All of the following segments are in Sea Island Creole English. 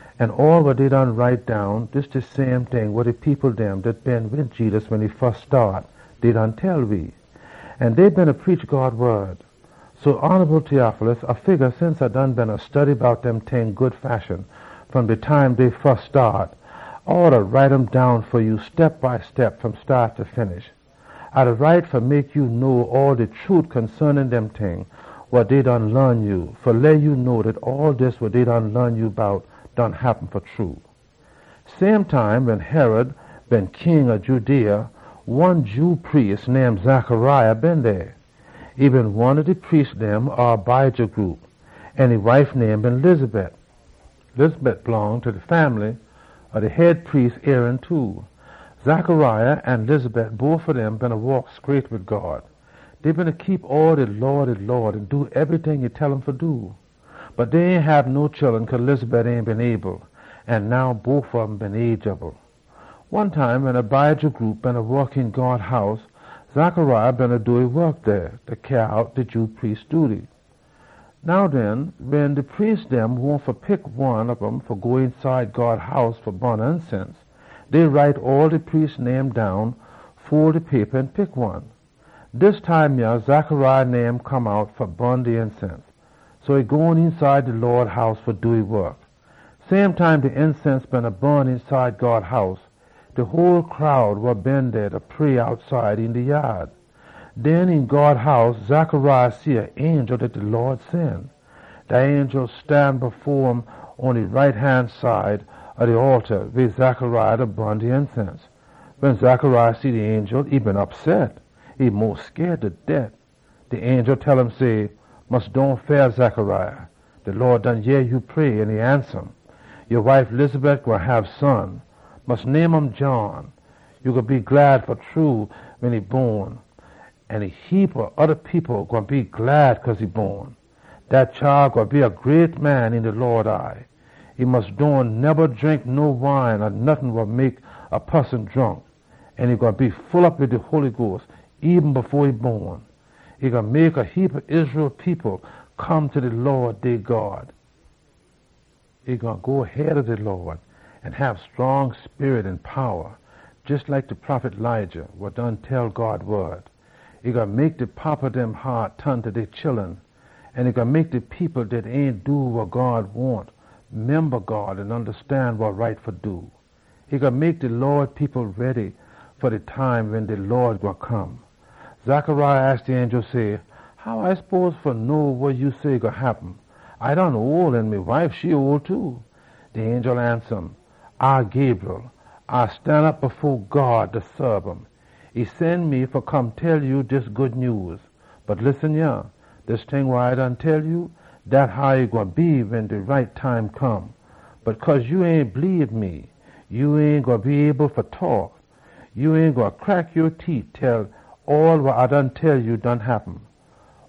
An all wa dey done write down, dis de same ting wa de people dem dat been wid Jedus wen e fus staat, dey done tell we. An dey beena preach God wod. So, Honorable Theophilus, A figga since A done beena study bout dem ting good fashion fom de time dey fus staat, A oughta write um down fa ya step by step fom staat ta finish. A da write fa mek ya know all de trute consaanin dem ting wa dey done laan ya, fa leh ya know dat all dis wa dey laan ya bout done happen fa true. Same time wen Herod been king ob Judea, one Jew priest name Zechariah been dey. E been one ob de priest dem ob Abijah group. An e wife name been Lizzybet. Lizzybet blongst ta de fambly ob de head Priest Aaron too. Zechariah an Lizzybet beena waak scraight wid God. Dey beena keep all de Law ob de Lawd an do ebryting e tell um fa do. Bot dey ain hab no chullun cause Lizzybet ain been able. An now dey bof been ole. One time wen Abijah group beena wok een God House, Zechariah beena do e wok dey, da cyaa out de priest judy. Now den, wen de priest dem wahn fa pick one ob um fa go eenside God House fa bun incense, dey write all de priest dem name down, fole de paper an pick one. Dis time yah Zechariah name come out fa bun de incense. So e gone eenside de Lawd house fa do e wok. Same time de incense beena bun eenside God House, de whole crowd wa been dey beena pray outside een de yaad. Den een God House, Zechariah see a angel dat de Lawd sen. Dat angel stan fo um pon de right han side ob de alta, weh Zechariah da bun de incense. Wen Zechariah see de angel, e been opsot. E mos scaid ta det. De angel tell um say, “Mus dohn feah, Zechariah! De Lawd done yeh ya pray, an e ansa um. Ya wife Lizzybet gwine hab son. Mus name um John. Ya gwine be glad fa true wen e bon, an a heapa oda people gwine be glad cause e bon! Dat chile gwine be a great man een de Lawd eye. E mus dohn neba drink no wine or nottin wa mek a poson dronk. An e gwine be full op wid de Holy Sperit eben fo e bon. E gwine mek a heapa Israel people come ta de Lawd dey God. E gwine go head ob de Lawd an hab scrong sperit an powa, jes like de prophet Elijah, wa done tell God wod. E gwine mek de fada dem haat ton ta dey chullun. An e gwine mek de people dat ain do wa God wahn, memba God an ondastan wa right fa do. E gwine mek de Lawd people ready fa de time wen de Lawd gwine come.” Zechariah aks de angel say, “How A spose fa know wa ya say gwine happen? A done ole, an me wife, e ole too.” De angel ansa um, “A Gabriel. A da stanop fo God, da saab um. E sen me fa come tell ya dis good nyews. Bot listen yah! Dis ting wa A done tell ya, dat how e gwine be wen de right time come. Bot cause ya ain bleebe me, ya ain gwine be able fa taak. Ya ain gwine crack ya teet til all wa A tell ya done happen.”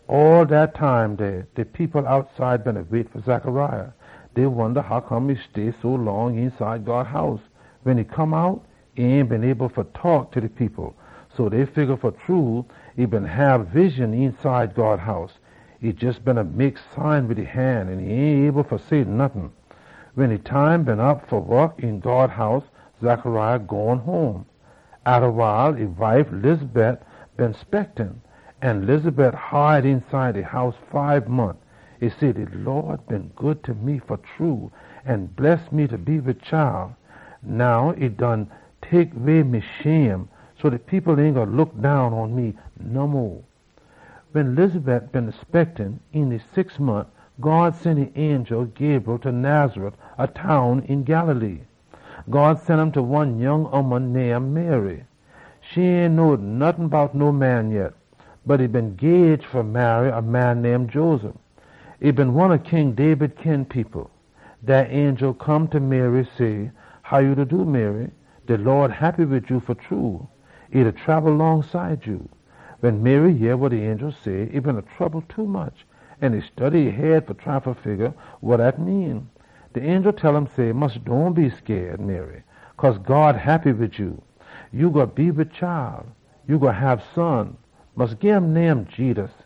All dat time dey, de people outside beena wait fa Zechariah. Dey wonda hoccome e stay so long eenside God House. Wen e come out, e ain been able fa taak ta de people, so dey figga fa true e been hab wision eenside God House. E jes beena mek sign wid e han, an e ain able fa say nottin. Wen e time been op fa wok een God House, Zechariah gone home. Atta wile, e wife Lizzybet been speckin. An Lizzybet hide eenside e house fibe mont. E say, “De Lawd been good ta me fa true an bless me fa be wid chile. Now e done tek way me shame so dat people ain gwine look down pon me no mo!” Wen Lizzybet been speckin, een e six mont God sen e angel Gabriel ta Nazareth, a town een Galilee. God sen um ta one nyoung ooman name Mary. E ain know nottin bout no man yet, bot e been gage fa marry a man name Joseph, wa been one ob King David kin people. Dat angel come ta Mary say, “How ya da do, Mary. De Lawd done bless ya fa true! E da trabel longside ya!” Wen Mary yeh wa de angel say, e beena trouble tommuch, an e study e head fa try fa figga wa dat mean. De angel tell um say, “Mus dohn be scaid, Mary, cause God heppy wid ya. Ya gwine be wid chile. Ya gwine hab son. Mus gim name Jedus.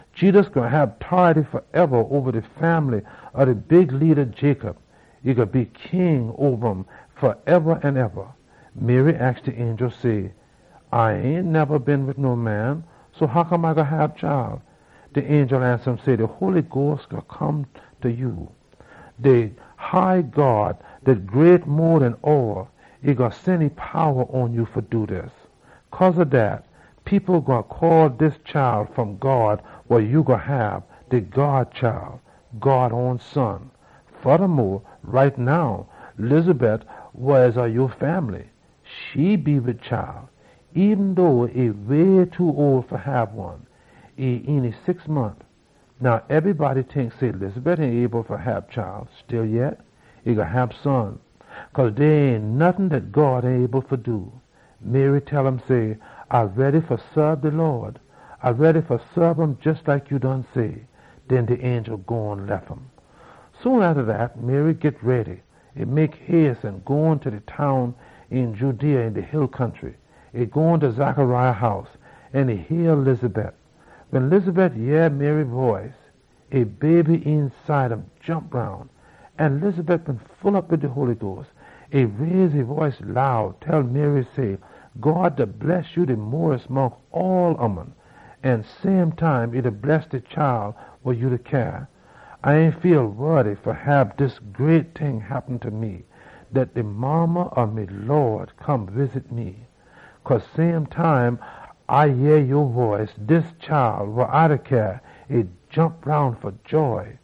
Jedus gwine hab tority faeba oba de fambly ob Jacob. E gwine rule oba um faeba an eba!” Mary aks de angel say, “A ain neba been wid no man. So hoccome a gwine hab chile?” De angel ansa um, “De Holy Sperit gwine come ta ya. De High God dat great mo den all, e gwine sen e powa pon ya fa do dis. Cause ob dat, people gwine call dis chile fom God wa ya gwine hab, de God Chile, God own Son. Fodamo, Lizzybet, wa kin ta ya, e wid chile. Eben dough e way too ole fa hab chullun, e een e six mont. Now ebrybody tink say, Lizzybet ain able fa hab chile. Stillyet, e gwine hab son. Cause dey ain nottin dat God ain able fa do.” Mary tell um say, “A ready fa saab de Lawd. A ready fa saab um jes like ya done say.” Den de angel gone lef um. Soon atta dat, Mary git ready. E mek hace an gone ta a town een Judea een de hill country. E gone ta Zechariah house, an e hail Lizzybet. Wen Lizzybet yeh Mary boice, e baby eenside um jomp roun. An Lizzybet been full op wid de Holy Sperit. E raise e boice loud, tell Mary say, “God da bless ya mo den all oda ooman, an same time e bless de chile wa ya da cyaa! A ain feel wody fa hab dis great ting happen ta me, dat de modda ob me Lawd come wisit me. Cause same time A yeh ya boice, dis chile wa A da cyaa, e jomp roun fa joy.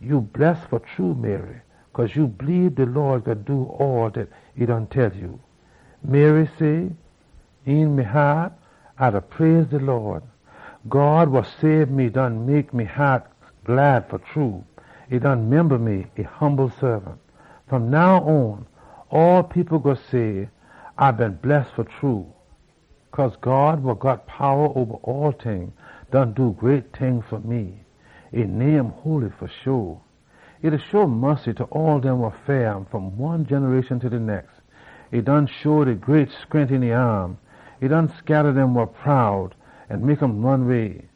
Ya bless fa true, Mary, cause ya bleebe de Lawd gwine do all dat e done tell ya!” Mary say, “Een me haat A da praise de Lawd. God wa sabe me done mek me haat glad fa true. E done memba me, e humble saabant! Fom now on, all people gwine say A been bless fa true. Cause God wa got powa oba all ting, e done do great ting fa me. E name holy fa sho. E da show mussy ta all dem wa feah um, fom one generation ta de nex. E done show de great scrent een e aam. E done scatta dem wa proud an mek um ron way.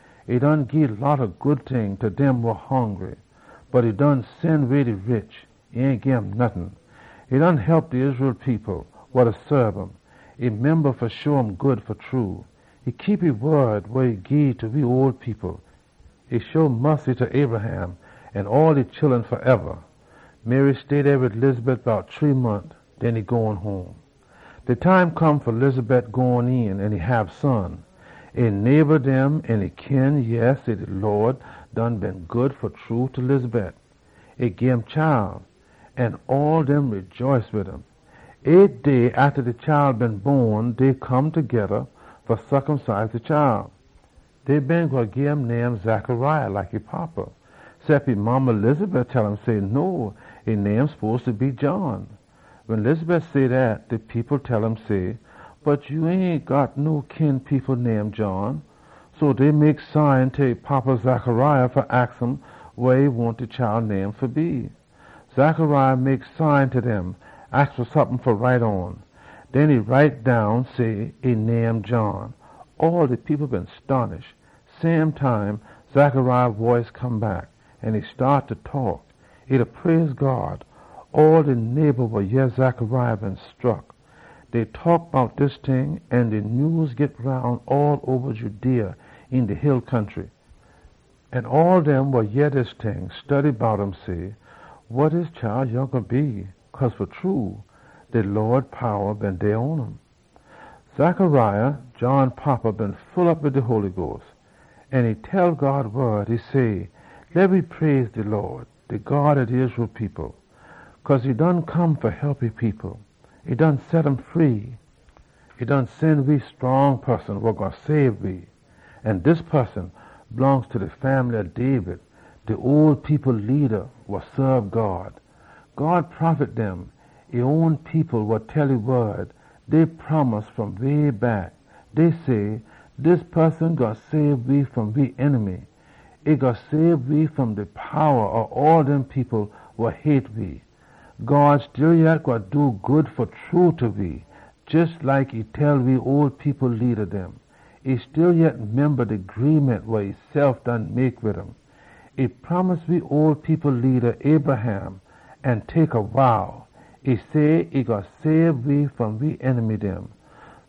E done gii plenty good ting ta dem wa hongry. Bot e done sen way de rich. E ain gim nottin. E done hep de Israel people, wa da saab um. E ain fagit e promise. E keep e wod wa e gii ta we ole people. E show mussy ta Abraham an all e chullun faeba!” Mary stay dey wid Lizzybet bout shree mont. Den e gone home. De time come fa Lizzybet fa go een, an e hab son. E neighba dem an e kin yeh say de Lawd done hab mussy pon Lizzybet. E gim chile. An all dem rejaice wid um. Eight day atta de chile been bon, dey come togeda fa circumcise de chile. Dey been gwine gim name Zechariah, like e fada. Cep e modda Lizzybet tell um say, “No! E name spose fa be John.” Wen Lizzybet say dat, de people tell um say, “Bot ya ain got no kin people name John!” So dey mek sign ta e fada Zechariah fa aks um wa e wahn de chile name fa be. Zechariah mek sign ta dem, aks fa sompin fa write pon. Den e write down say, “E name John.” All de people been stonish. Same time Zechariah boice come back, an e staat fa taak. E da praise God. All de neighba wa yeh Zechariah been scruck. Dey taak bout dis ting, an de nyews git roun all oba Judea een de hill country. An all dem wa yeh dis ting, study bout um say, “Wa dis chile yah gwine be?” Cause fa true de Lawd powa been dey pon um. Zechariah, John fada, been full op wid de Holy Sperit, an e tell God wod. E say, “Leh we praise de Lawd, de God ob de Israel people! Cause e done come fa hep e people. E done set um free. E done sen we scrong poson wa gwine sabe we. An dis Poson blongst ta de fambly ob David, de ole people leada wa saab God. God own prophet dem, dey promise fom way back. Dey say, ‘Dis poson gwine sabe we fom we enemy. E gwine sabe we fom de powa ob all dem people wa hate we.’ God hab mussy pon we, jes like e been tell we ole people. E stillyet memba de greement wa e esef done mek wid um. E promise we ole people leada Abraham an mek a wow. E say e gwine sabe we fom we enemy dem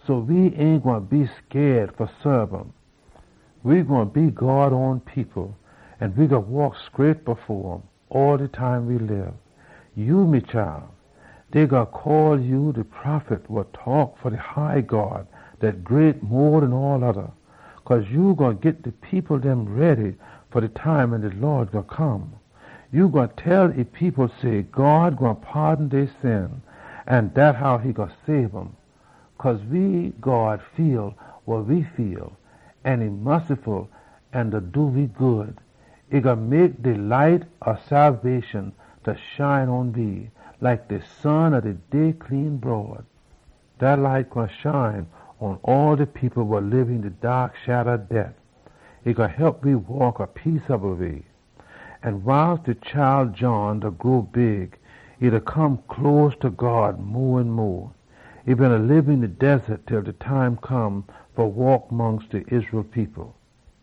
so we ain gwine be scaid fa saab um. We gwine be God own people, da waak scraight fo um all de time we lib. Me chile, dey gwine call ya de prophet wa taak fa de Mos High God. Cause ya gwine git de people dem ready fa de time wen de Lawd gwine come. Ya gwine tell e people say God gwine paadon dey sin, an dat how e gwine sabe um. Cause we God feel wa we feel, an e mussyful an do we good. E gwine mek de light ob sabation fa shine pon we like de sun ob day clean broad. Dat light gwine shine pon all de people wa lib een de daak shada ob det. E gwine hep we waak a peaceable way.” An wiles de chile John da grow big, e da come close ta God mo an mo. E beena lib een de wildaness til de time come fa wok mongst de Israel people.